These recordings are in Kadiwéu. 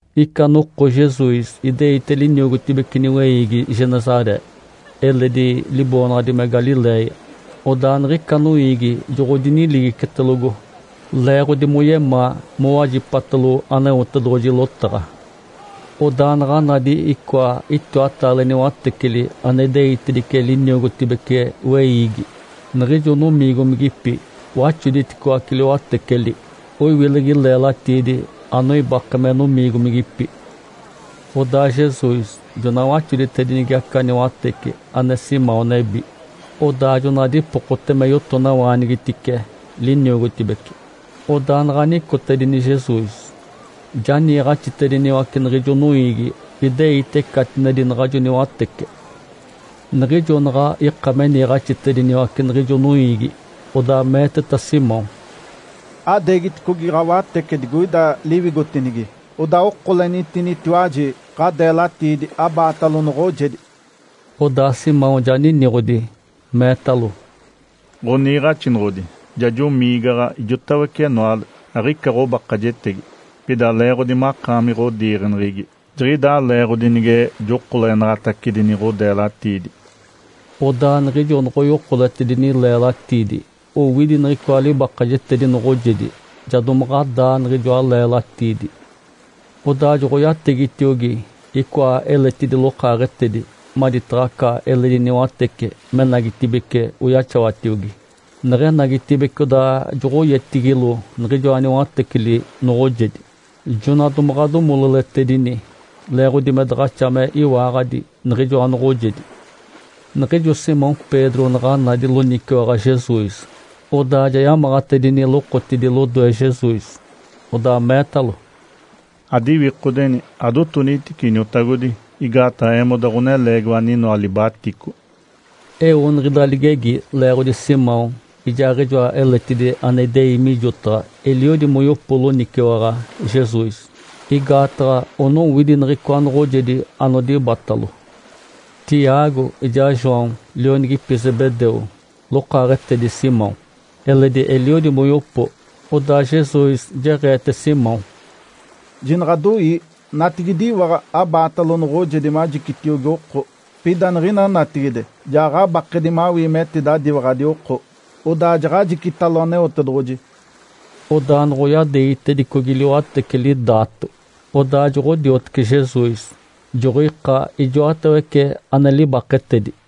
Ica noko Jesus ideite liniogotibece niweiigi Genesaré (eledi liboonaɡ̶adi me Galiléia), odaa niɡ̶ica noiigi joɡ̶odiniligicetelogo, leeɡ̶odi moyemaa mowajipatalo Aneotedoɡ̶oji lotaɡ̶a. Odaa naɡ̶a nadi icoa itiwataale niwateceli ane ideitedice liniogotibece weiigi. Niɡ̶ijo nomiigomigipi waxoditicoace liwateceli, oiwilegi leelatiidi anoibake me nomiigomigipi. Odaa Jesus jona waxoditedinigi aca niwatece ane Simão nebi. Odaa jona dipokote me yotonawaanigitice liniogotibece. Odaa naɡ̶a nicotedini Jesus, ja niiɡ̶axitediniwace niɡ̶ijo noiigi, ideite catinedi naɡ̶ajo niwatece. Niɡ̶ijo naɡ̶a ika me niiɡ̶axitediniwace niɡ̶ijo noiigi, odaa meeteta Simão, “Adeegiticogi ɡ̶awatece digoida liwigotinigi, odaa okolenitinitiwaji ɡ̶adeelatiidi abaatalo noɡ̶ojedi.” Odaa Simão ja niniɡ̶odi, meetalo, “Ǥoniiɡ̶axinoɡ̶odi, ja jomiigaɡ̶a ijotawece enoale, aɡ̶ica ɡ̶obakajetege. Pida leeɡ̶odi makaami ɡ̶odiiɡ̶eneɡ̶egi, jiɡ̶idaa leeɡ̶odi nige jokolenaɡ̶atacedini ɡ̶odeelatiidi.” Odaa niɡ̶ijo noɡ̶oyokoletedini leelatiidi, owidi niɡ̶icoa libakajetedi noɡ̶ojedi, ja domaɡ̶a daa niɡ̶ijoa leelatiidi. Odaa joɡ̶oyategitiogi icoa eletidi lokaaɡ̶etedi maditaɡ̶a aca eledi niwatece menagitibeci oyaxawatiogi. Neɡ̶enagitibeci odaa joɡ̶oyetigilo niɡ̶ijoa niwateceli noɡ̶ojedi, jona domaɡ̶a domololetedini, leeɡ̶odi me daɡ̶axa me iwaaɡ̶adi niɡ̶ijoa noɡ̶ojedi. Niɡ̶ijo Simão Pedro naɡ̶a nadi loniciwaɡ̶a Jesus, odaa ja yamaɡ̶atedini lokotidi lodoe Jesus, odaa meetalo, “Adiwikodeni, adotonitice Iniotagodi, igaataɡ̶a eemoda ɡ̶oneleegiwa aninoa libatico!” Eo niɡ̶ida ligegi leeɡ̶odi Simão ijaaɡ̶ijoa eletidi ane idei mijotaɡ̶a eliodi moyopo loniciwaɡ̶a Jesus, igaataɡ̶a onowidi niɡ̶icoa noɡ̶ojedi anodibatalo. Tiago ijaa João lionigipi Zebedeu, lokaaɡ̶etedi Simão, eledi eliodi moyopo. Odaa Jesus jeɡ̶eete Simão, “Jinaɡ̶adoii! Natigidiwaɡ̶a abaatalo noɡ̶ojedi majicitiogi oko. Pida niɡ̶ina natigide ja ɡ̶abakedi mawii metidadiwaɡ̶adi oko, odaa jaɡ̶ajicitalo Aneotedoɡ̶oji.” Odaa noɡ̶oyadeegitedicogi liwateceli daato, odaa joɡ̶odiotece Jesus, joɡ̶oika ijoatawece ane libaketedi.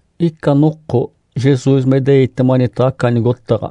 Ica noko, Jesus me ideite manitaɡ̶a aca nigotaɡ̶a,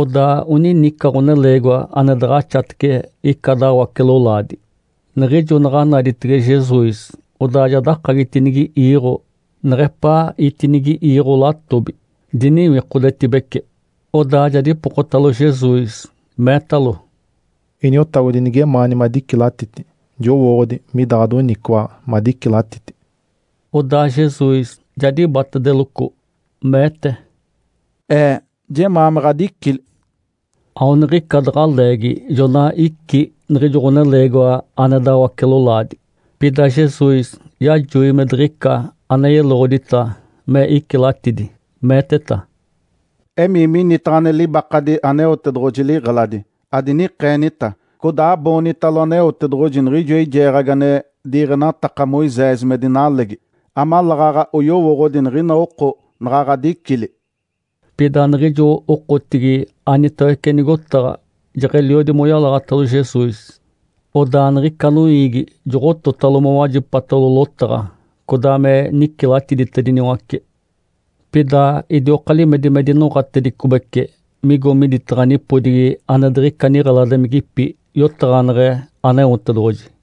odaa onini ica ɡ̶oneleegiwa ane daɡ̶axatece ica dawace-lolaadi. Niɡ̶ijo naɡ̶a naditege Jesus, odaa ja dakagitinigi iiɡ̶o neɡ̶epaa itinigi iiɡ̶o latobi, diniwikodetibece. Odaa ja dipokotalo Jesus, meetalo, “Iniotagodi, nigemaani madicilatiti, jowooɡ̶odi mida ɡ̶adoniciwaɡ̶a madicilatiti.” Odaa Jesus ja dibatedeloco, meete, “Ee! Jemaa me ɡ̶adicili!” Aoniɡ̶ica daɡ̶a leegi jona icí niɡ̶ijo ɡ̶oneleegiwa ane dawace-lolaadi. Pida Jesus yajoi me diɡ̶ica ane yeloɡ̶odita me icilatidi, meeteta, “Emii minitaɡ̶a ane libakadi Aneotedoɡ̶oji liɡ̶eladi, adinikeenita, codaa aboonitalo Aneotedoɡ̶oji niɡ̶ijo eijeeɡ̶agi ane diiɡ̶enataka Moisés me dinalegi, amaleeɡ̶aɡ̶a oyowooɡ̶odi niɡ̶ina oko naɡ̶a ɡ̶adicili.” Pida niɡ̶ijo okotigi anitawece nigotaɡ̶a jeɡ̶eliodi moyalaɡ̶atalo Jesus, odaa niɡ̶ica noiigi joɡ̶ototalo mowajipatalo lotaɡ̶a, codaa me nicilatiditediniwace. Pida idioka limedi me dinoɡ̶atedicobece, migo miditaɡ̶a nipodigi ane diɡ̶ica niɡ̶eladimigipi, yotaɡ̶aneɡ̶e Aneotedoɡ̶oji.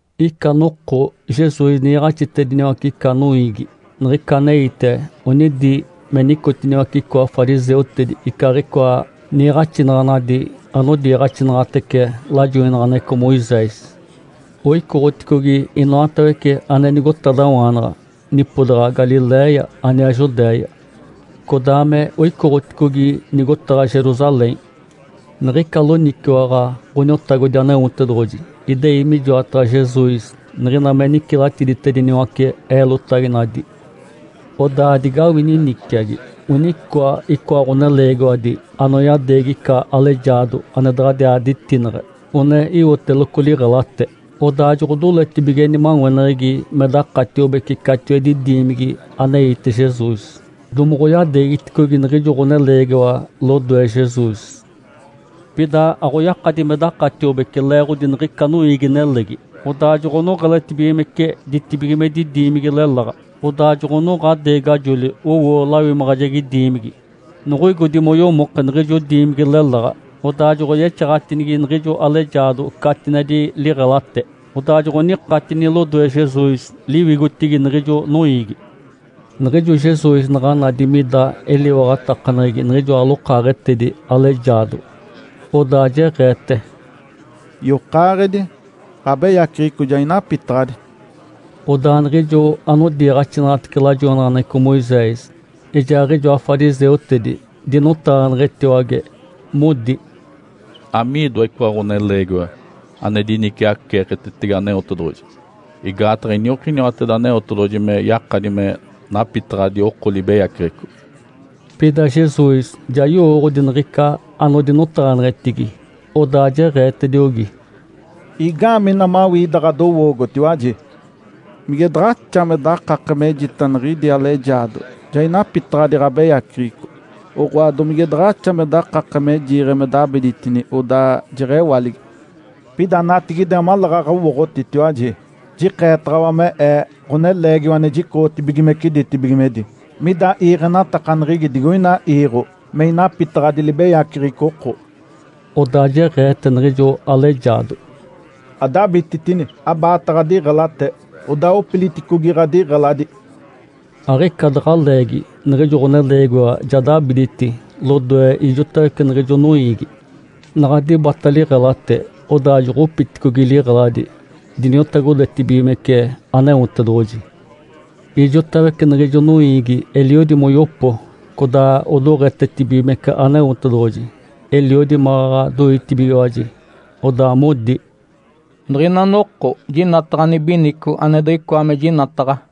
Ica noko Jesus niiɡ̶axitediniwace ica noiigi. Niɡ̶ica aneite, onidi me nicotiniwace icoa fariseutedi icaaɡ̶icoa niiɡ̶axinaɡ̶anadi anodiiɡ̶axinaɡ̶atece lajoinaɡ̶aneɡ̶eco Moisés. Oicoɡ̶oticogi inoatawece ane nigotadawaanaɡ̶a nipodaɡ̶a Galiléia aniaa Judéia, codaa me oicoɡ̶oticogi nigotaɡ̶a Jerusalém. Niɡ̶ica loniciwaɡ̶a Ǥoniotagodi Aneotedoɡ̶oji idei mijoataɡ̶a Jesus niɡ̶ina me nicilatiditediniwace eelotaginadi. Odaa digawini niciagi, onicoa icoa ɡ̶oneleegiwadi anoyadeegi ica alejaado ane daɡ̶adiaa ditineɡ̶e, one iwoteloco liɡ̶elate, odaa joɡ̶odoletibige nimaweneɡ̶egi me dakatiobece catiwedi diimigi aneite Jesus, domoɡ̶oyadeegiticogi niɡ̶ijo ɡ̶oneleegiwa lodoe Jesus. Pida aɡ̶oyakadi me dakatiobece leeɡ̶odi niɡ̶ica noiigi-nelegi. Odaa joɡ̶onoɡ̶eletibigimece ditibigimedi diimigi leláɡ̶a. Odaa jonoɡ̶onoɡ̶a deegajoli, owo lawimaɡ̶ajegi diimigi. Noɡ̶oigodi moyomoke niɡ̶ijo diimigi leláɡ̶a, odaa joɡ̶oyexaɡ̶atinigi niɡ̶ijo alejaado catinedi liɡ̶elate, odaa joɡ̶onikatini lodoe Jesus liwigotigi niɡ̶ijo noiigi. Niɡ̶ijo Jesus naɡ̶a nadi mida eliwaɡ̶atakaneɡ̶egi niɡ̶ijoa lokaaɡ̶etedi alejaado, odaa jeɡ̶eete, “Yokaaɡ̶edi, ɡ̶abeyaceɡ̶eco ja inapitaɡ̶adi.” Odaa niɡ̶ijo anodiiɡ̶axinaɡ̶atece lajoinaɡ̶aneɡ̶eco Moisés, ijaaɡ̶ijoa fariseutedi dinotaɡ̶aneɡ̶etiwage, modi, “Amiidoa icoa ɡ̶oneleegiwa ane diniciaceeketetege Aneotedoɡ̶oji? Igaataɡ̶a iniokiniwateda Aneotedoɡ̶oji me yakadi me napitaɡ̶adi oko libeyaceɡ̶eco.” Pida Jesus ja yowooɡ̶odi niɡ̶ica anodinotaɡ̶aneɡ̶etigi, odaa jeɡ̶eetediogi, “Igaamee ina mawii ida ɡ̶adowoogotiwaji? Mige daɡ̶axa me dakake mejita niɡ̶idi alejaado, ‘Ja inapitaɡ̶adi ɡ̶abeyaceɡ̶eco,’ oɡ̶oa, domige daɡ̶axa me dakake me jiiɡ̶e me dabiditini, odaa jeɡ̶ewaligi? Pida natigide amaleeɡ̶aɡ̶a owooɡ̶otitiwaji, jikeetaɡ̶awa me Ee, Ǥoneleegiwa ane jicoɡ̶otibigimece ditibigimedi, mida iiɡ̶enatakaneɡ̶egi digoina iiɡ̶o me inapitaɡ̶adi libeyaceɡ̶eco oko.” Odaa jeɡ̶eete niɡ̶ijo alejaado, “Adabititini! Abaata ɡ̶adiɡ̶elate, odaa opiliticogi ɡ̶adiɡ̶eladi!” Aɡ̶ica daɡ̶a leegi niɡ̶ijo ɡ̶oneleegiwa ja dabiditi lodoe ijotawece niɡ̶ijo noiigi, naɡ̶a dibata liɡ̶elate, odaa joɡ̶opiticogi liɡ̶eladi, diniotagodetibigimece Aneotedoɡ̶oji. Ijotawece niɡ̶ijo noiigi eliodi moyopo, codaa odoɡ̶etetibigimece Aneotedoɡ̶oji. Eliodi maɡ̶aɡ̶a doitibigiwaji, odaa modi, “Niɡ̶ina noko, jinataɡ̶a nibinico ane diɡ̶icoa me jinataɡ̶a!”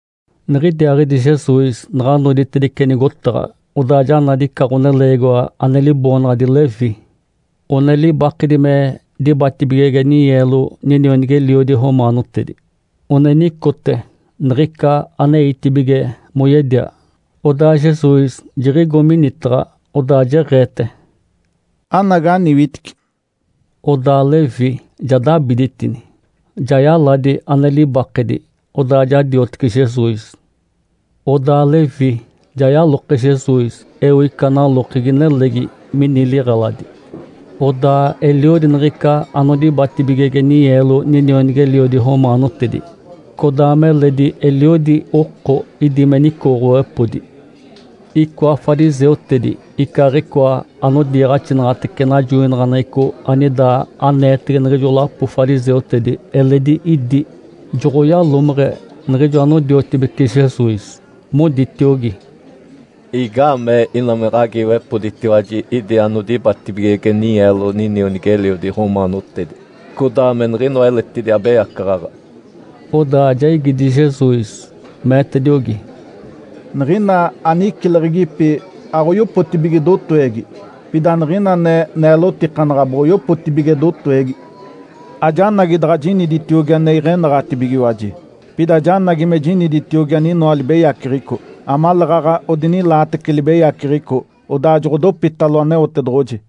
Niɡ̶idiaaɡ̶idi Jesus naɡ̶a noditedice nigotaɡ̶a, odaa ja nadi ica ɡ̶oneleegiwa ane liboonaɡ̶adi Levi. One libakedi me dibatibigege ninyeelo ninionigi-eliodi romaanotedi. One nicote niɡ̶ica aneitibige moyedia. Odaa Jesus jiɡ̶igo minitaɡ̶a, odaa jeɡ̶eete, “Anagi, aniwitici!” Odaa Levi ja dabiditini, ja yaladi ane libakedi, odaa ja diotece Jesus. Odaa Levi ja yaloke Jesus eo ica nalokegi nelegi mini liɡ̶eladi. Odaa eliodi niɡ̶ica anodibatibigege ninyeelo ninionigi-eliodi romaanotedi, codaa meledi eliodi oko idi me nicoɡ̶owepodi. Icoa fariseutedi icaaɡ̶icoa anodiiɡ̶axinaɡ̶atece najoinaɡ̶aneɡ̶eco anida aneetege niɡ̶ijo lapo fariseutedi eledi idi, joɡ̶oyalomeɡ̶e niɡ̶ijo anodiotibece Jesus, moditiogi, “Igaamee ina me ɡ̶agiiwepoditiwaji idi anodibatibigege ninyeelo ninionigi-eliodi romaanotedi, codaa me niɡ̶inoa eletidi abeyacaɡ̶aɡ̶a?” Odaa ja igidi Jesus, meetediogi, “Niɡ̶ina anicileɡ̶egipi aɡ̶oyopotibige dotowegi, pida niɡ̶ina ane neelotikanaɡ̶a boɡ̶oyopotibige dotowegi. Ajanagi daɡ̶a jiniditiogi ane iɡ̶enaɡ̶atibigiwaji, pida janagi me jiniditiogi aninoa libeyaceɡ̶eco amaleeɡ̶aɡ̶a odinilaatece libeyaceɡ̶eco, odaa joɡ̶odopitalo Aneotedoɡ̶oji.”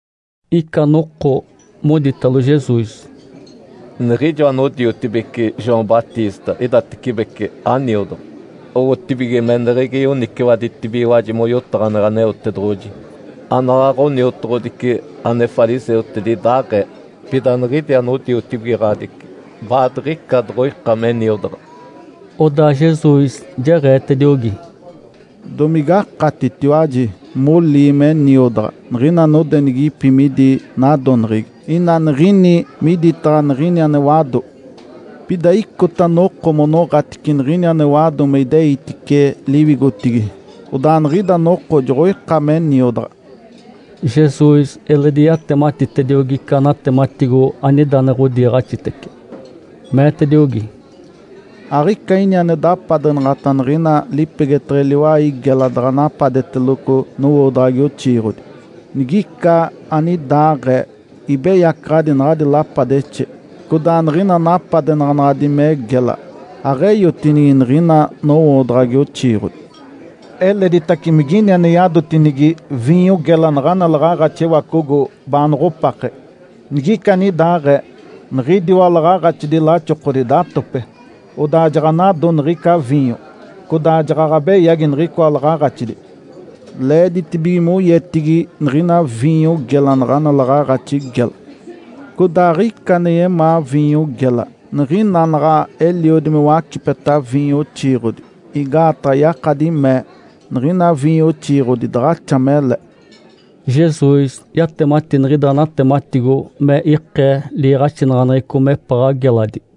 Ica noko moditalo Jesus, “Niɡ̶ijo anodiotibeci João Batista idatecibece aniodaɡ̶a, owotibige meneɡ̶egi yoniciwaditibigiwaji moyotaɡ̶aneɡ̶e Aneotedoɡ̶oji. Anaɡ̶aɡ̶a oniotoɡ̶odici ane fariseutedi idaaɡ̶ee. Pida niɡ̶idi anodiotibigaɡ̶adici baadiɡ̶ica doɡ̶oika me niodaɡ̶a.” Odaa Jesus jeɡ̶eetediogi, “Domigakatitiwaji molii me niodaɡ̶a, niɡ̶ina nodenigipi midi nadoneɡ̶egi, ina niɡ̶ini miditaɡ̶a niɡ̶ini ane wado? Pida icota noko monoɡ̶atice niɡ̶ini ane wado me ideitice liwigotigi. Odaa niɡ̶ida noko joɡ̶oika me niodaɡ̶a.” Jesus eledi yatematitediogi ica natematigo anida ane ɡ̶odiiɡ̶axitece, meetediogi, “Aɡ̶ica ini ane dapadenaɡ̶ata niɡ̶ina lipegeteɡ̶e liwai gela daɡ̶a napadeteloco nowoodaɡ̶agi oxiiɡ̶odi. Nigica anidaɡ̶aee, ibeyacaɡ̶adi naɡ̶adi lapadexe, codaa niɡ̶ina napadenaɡ̶anaɡ̶adi me gela aɡ̶eyotinigi niɡ̶ina nowoodaɡ̶agi oxiiɡ̶odi. Eleditace migini ane yadotinigi viinyo gela naɡ̶ana laɡ̶aaɡ̶axi ewacogo baanoɡ̶opake. Nigica anidaaɡ̶ee, niɡ̶idiwa laɡ̶aaɡ̶axidi laxokodi datope, odaa jaɡ̶anado niɡ̶ica viinyo, codaa jaɡ̶aɡ̶a beyagi niɡ̶icoa laɡ̶aaɡ̶axidi. Leeditibige moyetigi niɡ̶ina viinyo gela naɡ̶ana laɡ̶aaɡ̶axi gela. Codaa aɡ̶ica ane yemaa viinyo gela, niɡ̶ina naɡ̶a eliodi me wacipeta viinyo oxiiɡ̶odi, igaataɡ̶a yakadi mee, ‘Niɡ̶ina viinyo oxiiɡ̶odi daɡ̶axa mele.’” (Jesus yatemati niɡ̶ida natematigo me ikee liiɡ̶axinaɡ̶aneɡ̶eco mepaɡ̶a geladi.)